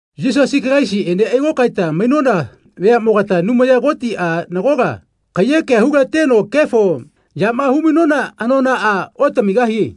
Yisasi Kalaisiꞌene ailokaeta mainona veaꞌmogata Anumaya Kotiꞌa nagola kaiyekea hulateno kefo yama humainona anonaꞌa otamigahie.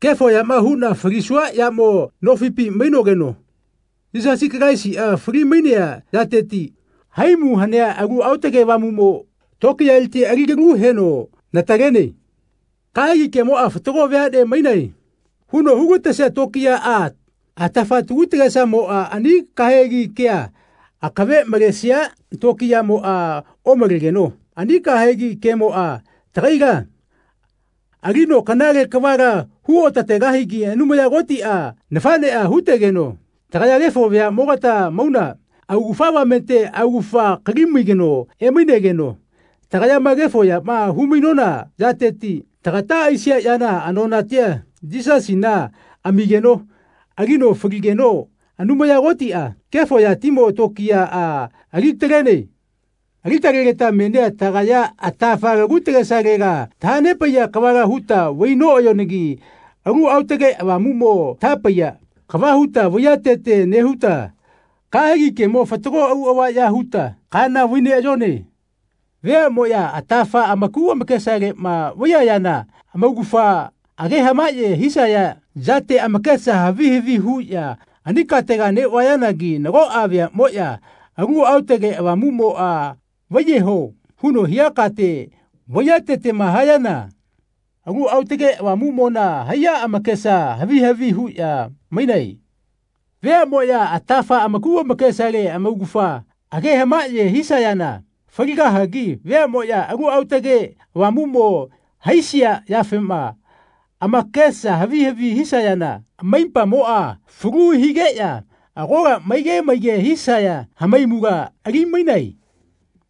Kefo yama huꞌna falisua yamo nofipi mainogeno Yisasi Kalaisiꞌa falimainea yateti haimu hanea Alu Aotage Avamuꞌmo tokiyaleti ali kalu heno natalene. Kahegi kemoꞌa “Fatago veaꞌne mainae.” huno hulatesia tokiyaꞌa atafa tagu tagesamoꞌa ani kahegi kea akave malesia tokiyamoꞌa omalegeno ani kahegi kemoꞌa tagaila alino kanale kavala hu otategahigi Anumaya Kotiꞌa nafaꞌneꞌa hutegeno tagaya kefo veaꞌmogata mauna augafa avamete augafa kalimai kano emainegeno tagayama kefo yama humainona yateti tagata aisia yana anonatia Yisasina amigeno alino faligeno Anumaya Kotiꞌa kefo yatimo tokiyaꞌa alitalene. Alitalegeta menia tagaya atafa lagu tagesalela tahanepaiya kavala huta vainoꞌayonagi Alu Aotage Avamuꞌmo tahapaiya kava huta vaiyatete nehuta kahegi kemo fatago auꞌava ya huta kaana vaineꞌayone. Veaꞌmoꞌya atafa amaku amakesaleꞌma vaiyayana amaugafa age hamaꞌye hisaya yate amakesa havi havi huꞌya ani katega neꞌvayanagi nagoꞌa veaꞌmoꞌya Alu Aotage Avamuꞌmoꞌa “Vaiyeho.” huno hia kate vaiyatetema hayana Alu Aotage Avamuꞌmona haiya amakesa havi havi huꞌya mainae. Veaꞌmoꞌya atafa amaku amakesale amaugafa age hamahaꞌye hisayana faligahagi veaꞌmoꞌya Alu Aotage Avamuꞌmo haisia yafema amakesa havi havi hisayana amaipamoꞌa falu higeꞌya agola maige maige hisaya hamaimula alimainae.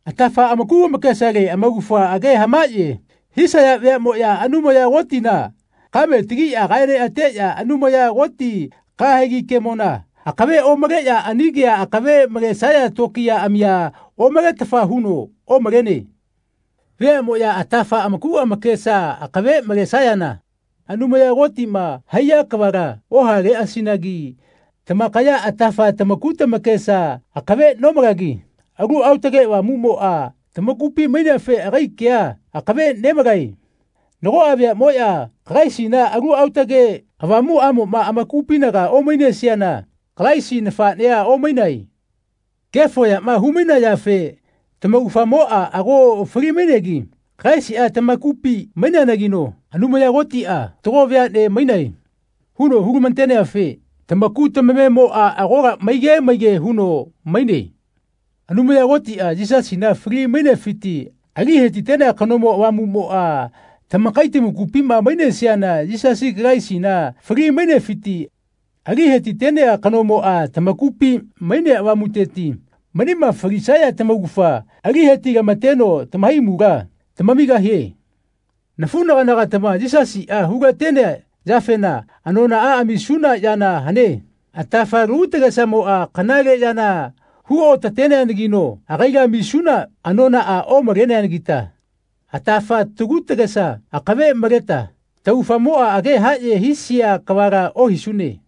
Atafa amaku amakesale amaugafa age hamaꞌye hisaya veaꞌmoꞌya Anumaya Kotina kame tagiꞌya kaeneꞌateꞌya Anumaya Koti kahegi kemona akave omaleꞌya ani kea akave malesaya tokiyaꞌamia omaletafa huno omalene. Veaꞌmoꞌya atafa amaku amakesa akave malesayana Anumaya Kotima haiya kavala ohaleꞌasinagi tamakaya atafa tamaku tamakesa akave nomalagi Alu Aotage Avamuꞌmoꞌa tamakupi maineafe agai kea akave nemalae. Nagoꞌa veaꞌmoꞌya Kalaisina Alu Aotage Avamuꞌamoꞌma amakupinaga omainesiana Kalaisi nafaꞌnea omainae. Kefo yama humainayafe tamaugafamoꞌa ago falimainegi Kalaisiꞌa tamakupi mainenageno Anumaya Kotiꞌa “Fatago veaꞌne mainae.” huno hulamateneafe tamaku tamamemoꞌa agola maige maige huno maine. Anumaya Kotiꞌa, Yisasina fali-mainefiti ali hetitenea kanomo, Avamuꞌmoꞌa tamakai tamakupima mainesiana Yisasi Kalaisina fali-mainefiti ali hetitenea kanomoꞌa tamakupi mainea Avamuteti manima falisaya tamaugafa ali hetilamateno tamahaimula tamamigahie. Nafuꞌnaganagatama Yisasiꞌa hulatenea yafena anonaꞌa amisuna yana hane. Atafa lagu tagesamoꞌa kanale yana huotateneanagino agaila amisuna anonaꞌa omaleanagita atafa lagu tagesa akave maleta taugafamoꞌa age haꞌye hisia kavala ohisune.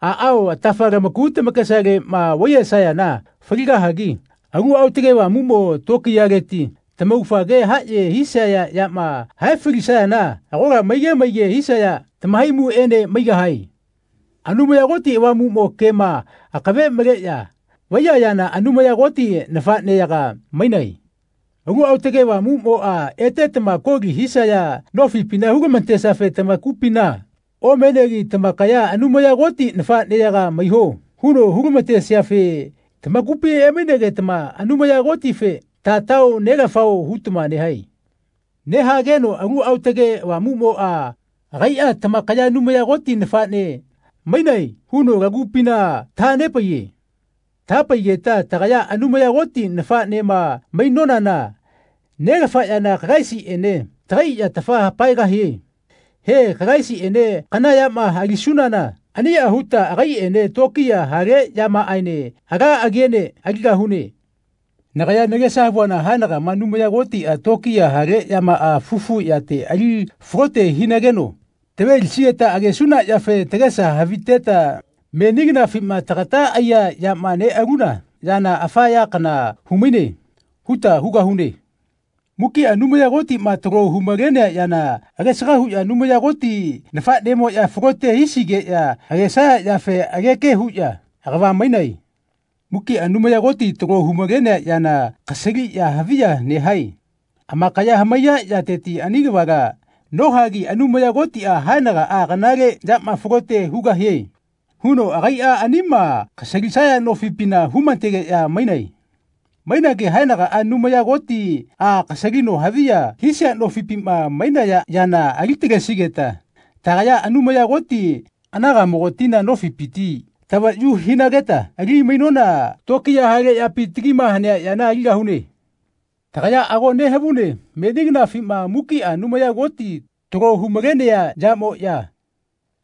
Aꞌao atafa lamaku tamakesaleꞌma vaiyesayana faligahagi Alu Aotage Avamuꞌmo tokiyaleti tamaugafa age haꞌye hisia yama hae falisayana agola maige maige hisaya tamahaimuꞌene maigahae. Anumaya Koti Avamuꞌmo kema akave maleꞌya vaiyayana Anumaya Koti nafaꞌneyaga mainae. Alu Aotage Avamuꞌmoꞌa etetama koli hisaya nofipina hulamatesiafe tamakupina omenegi tamakaila “Anumaya Koti nafaꞌneyaga maiho.” huno hulamatesiafe tamakupi emainegetama Anumaya Kotife “Tatao, Nelafao.” hutama nehae. Nehageno Alu Aotage Avamuꞌmoꞌa agaiꞌa “Tamakaya Anumaya Koti nafaꞌne mainae.” huno lagupina tahanepaiye. Tahapaigeta tagaya Anumaya Koti nafaꞌnema mainonana Nelafa yana Kalaisiꞌene tagai yatafa hapaegahie. He Kalaisiꞌene kana yama alisunana aniꞌa huta agaiꞌene tokiya haleꞌyamaꞌaene ala agiene aligahune. Nagaya nagesa havuana haenagama Anumaya Kotiꞌa tokiya hale yamaꞌa fufu yate ali falote hinageno tavelisigeta agesuna yafe tagesa haviteta “Meni kanafima tagata aiya yama neꞌaluna yana afa ya kana humaine.” huta hugahune. Mukiꞌa Anumaya Kotiꞌma talo humalenea yana agesaga huꞌya Anumaya Koti nafaꞌnemoꞌya falote hisigeꞌya agesaya yafe ageke huꞌya agava mainae. Mukiꞌa Anumaya Koti talo humalenea yana kasaliꞌya haviya nehae. Amakaya hamaiya yateti ani kavala nohagi Anumaya Kotiꞌa “Haenagaꞌa kanale yama falote hugahie.” huno agaiꞌa anima kasalisaya nofipina humategeꞌya mainae. Mainagi haenagaꞌa Anumaya Kotiꞌa kasalino haviya hisia nofipima mainaya yana ali-talesigeta tagaya, Anumaya Koti anagaꞌmogatina, nofipiti tavayu hinageta ali-mainona tokiya hale yapi tagima hanea yana aligahune. Tagaya ago nehavune meni kanafina mukiꞌa Anumaya Koti talo humalenea yamoꞌya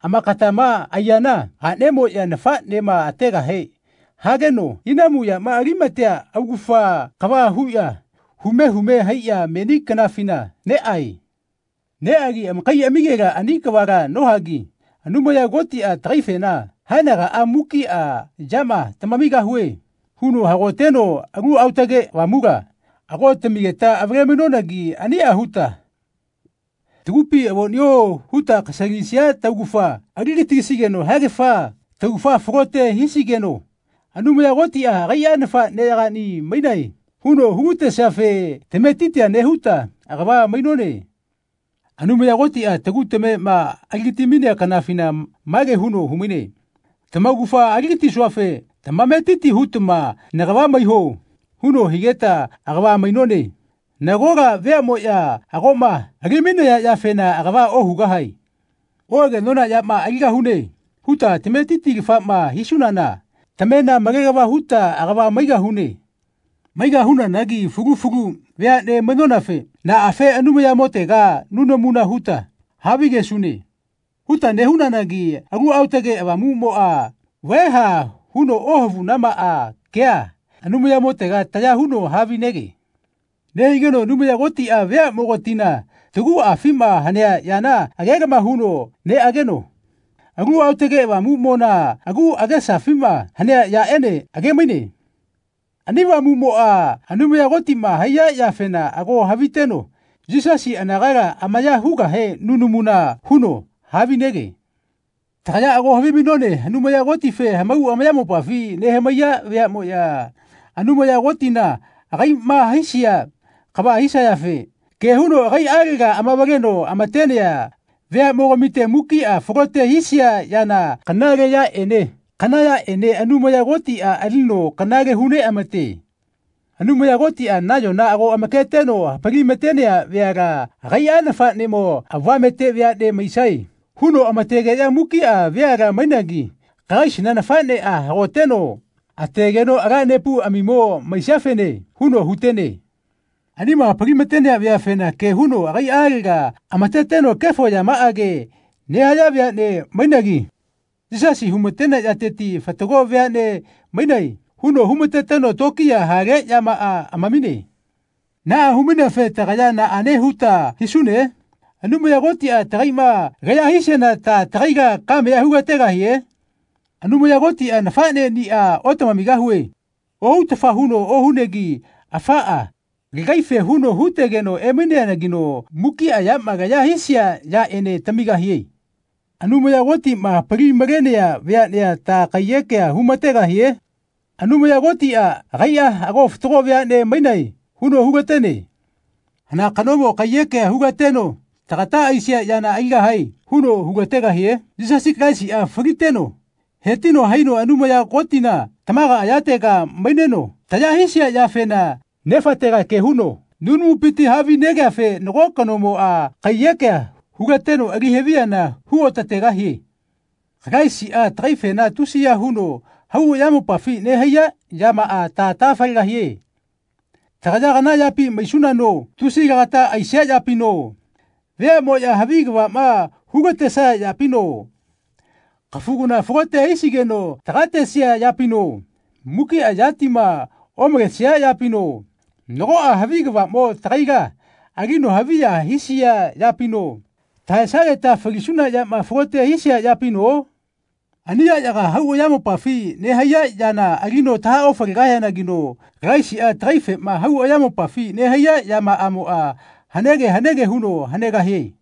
amakatama aiyana aꞌnemoꞌya nafaꞌnema ategahe hageno inamu yama alimatea augafa kava huꞌya hume hume haiꞌya meni kanafina neꞌae. Neꞌagi amakaiꞌamigela ani kavala nohagi Anumaya Kotiꞌa tagaifena “Haenagaꞌa mukiꞌa yama tamamigahue.” huno hagoteno Alu Aotage Avamula ago tamigeta avale-mainonanagi aniꞌa huta tagupi “Avoꞌnio.” huta kasalisia taugafa aligatisigeno haegafa taugafa falote hisigeno Anumaya Kotiꞌa agaiꞌa “Nafaꞌneyagaꞌni mainae.” huno hulatesiafe tametitia nehuta agava mainone. Anumaya Kotiꞌa tagu tamema aligati-mainea kanafina mage huno humaine “Tamaugafa aligatisuafe tamametiti hutama nagava maiho.” huno higeta agava mainone. Nagola veaꞌmoꞌya agoꞌma alimainaya yafena agava ohugahae. Oꞌagenona yama “Aligahune.” huta tametitilafama hisunana tamena malelava huta agava maigahune. Maigahunanagi fulu fulu veaꞌne mainonafe “Naꞌafe Anumayamotega nunamuna huta havigesune?” huta nehunanagi Alu Aotage Avamuꞌmoꞌa “Vaeha.” huno ohavunamaꞌa kea Anumayamotega taya huno havinege. Nehigeno Anumaya Kotiꞌa veaꞌmogatina taguꞌafima hanea yana agelama huno neꞌageno Alu Aotage Avamuꞌmona agu agesafima hanea yaꞌene agemaine. Ani Avamuꞌmoꞌa Anumaya Kotima haiya yafena ago haviteno Yisasi anagala amaya hugahe nunamuna huno havinege. Tagaya ago havimainone Anumaya Kotife hamau amayamopafi nehamaiya veaꞌmoꞌya, Anumaya Kotina agaiꞌma haisia kava hisayafe ke huno agaiꞌalega amavaleno amatenea veaꞌmogamite, mukiꞌa falote hisia yana kanale yaꞌene kana yaꞌene Anumaya Kotiꞌa alino kanale huneꞌamate. Anumaya Kotiꞌa nayona ago amaketeno hapalimatenea veala agaiꞌa nafaꞌnemo avamete veaꞌne maisae huno amategeꞌya mukiꞌa veala mainagi Kalaisina nafaꞌneꞌa hagoteno ategeno “Ala nepuꞌamimo maisiafene.” huno hutene. Anima hapalimatenea veafena ke huno agaiꞌalega amateteno kefo yamaꞌage nehaya veaꞌne mainagi Yisasi humatenea yateti “Fatago veaꞌne mainae.” huno humateteno tokiya hale yamaꞌa amamine. Naꞌa humaineafe tagaya naꞌane huta hisune? Anumaya Kotiꞌa tagaiꞌma laya hisiana ta tagaila kamea hulategahie? Anumaya Kotiꞌa “Nafaꞌneꞌnia otamamigahue.” ohutafa huno ohunegi afaꞌa lagaife huno hutegeno emaineanagino mukiꞌa yama laya hisia yaꞌene tamigahie. Anumaya Kotiꞌma hapali-malenea veaꞌnea ta kaiyekea humategahie? Anumaya Kotiꞌa agaiꞌa “Ago fatago veaꞌne mainae.” huno hulatene. Hana kanomo kaiyekea hulateno “Tagata aisia yana aligahae.” huno hulategahie? Yisasi Kalaisiꞌa faliteno hetino haino Anumaya Kotina tamaga ayatega maineno taya hisia yafena Nefatega ke huno nunamupiti havinegeafe nago kanomoꞌa kaiyekea hulateno ali haviyana huotategahie. Kalaisiꞌa tagaifena tusiya huno hau ayamopafi nehaiya yamaꞌa ta tahafalegahie? Tagaya kana yapi maisunano tusi lagata aisia yapino, veaꞌmoꞌya havi kavaꞌma hulatesaya yapino, kafu kana falote hisigeno tagatesia yapino, mukiꞌa yatima omalesia yapino, nagoꞌa havi kavaꞌmo tagaila alino haviya hisia yapino, tahaesageta falisuna yama falote hisia yapino? Ani yaꞌyaga hau ayamopafi nehaiya yana alino tahaofalegahianagino Kalaisiꞌa tagaifema hau ayamopafi nehaiya yamaꞌamoꞌa hanege hanege huno hanegahie.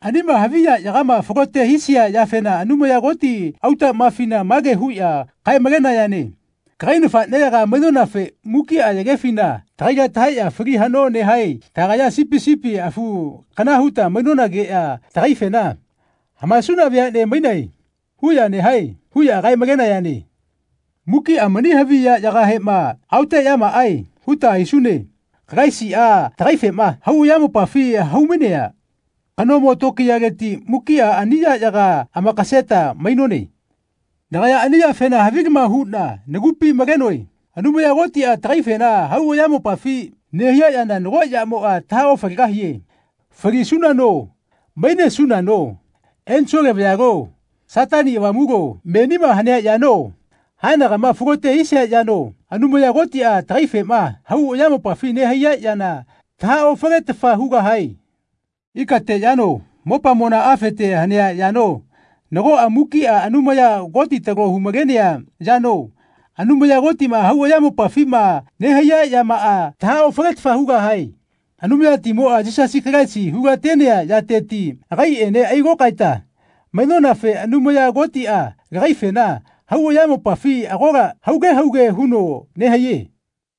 Anima havi yaꞌyagama falote hisia yafena Anumaya Koti autaꞌmafina mage huꞌya kae-malenayane “Kagai nafaꞌneyaga mainonafe mukiꞌa yagefina tagaila tahaeꞌya fali haꞌno nehae. Tagaya sipi sipi afu kana huta mainonageꞌya tagaifena ‘Hamaesuna veaꞌne mainae.’ huꞌya nehae.” huꞌya kae-malenayane. Mukiꞌa mani havi yaꞌyagahema “Aoteꞌyamaꞌae.” huta hisune. Kalaisiꞌa tagaifema hau ayamopafi haumainea kanomo tokiyaleti mukiꞌa ani yaꞌyaga amakaseta mainone. Nagaya ani yafena havilama huꞌna nagupi malenoe. Anumaya Kotiꞌa tagaifena hau ayamopafi nehaiya yana nago yamoꞌa tahaofalegahie. Falisunano, mainesunano, ensole vayalo, Satani Avamulo, menima hanea yano, haenagama falote hisia yano Anumaya Kotiꞌa tagaifema hau ayamopafi nehaiya yana tahaofaletafa hugahae. Ikate yano mopamona afete hanea yano nagoꞌa mukiꞌa Anumaya Koti talo humalenea yano Anumaya Kotina hau ayamopafima nehaiya yamaꞌa tahaofaletafa hugahae. Anumayatimoꞌa Yisasi Kalaisi hulatenea yateti agaiꞌene ailokaeta mainonafe Anumaya Kotiꞌa lagaifena hau ayamopafi agola hauge hauge huno nehaiye.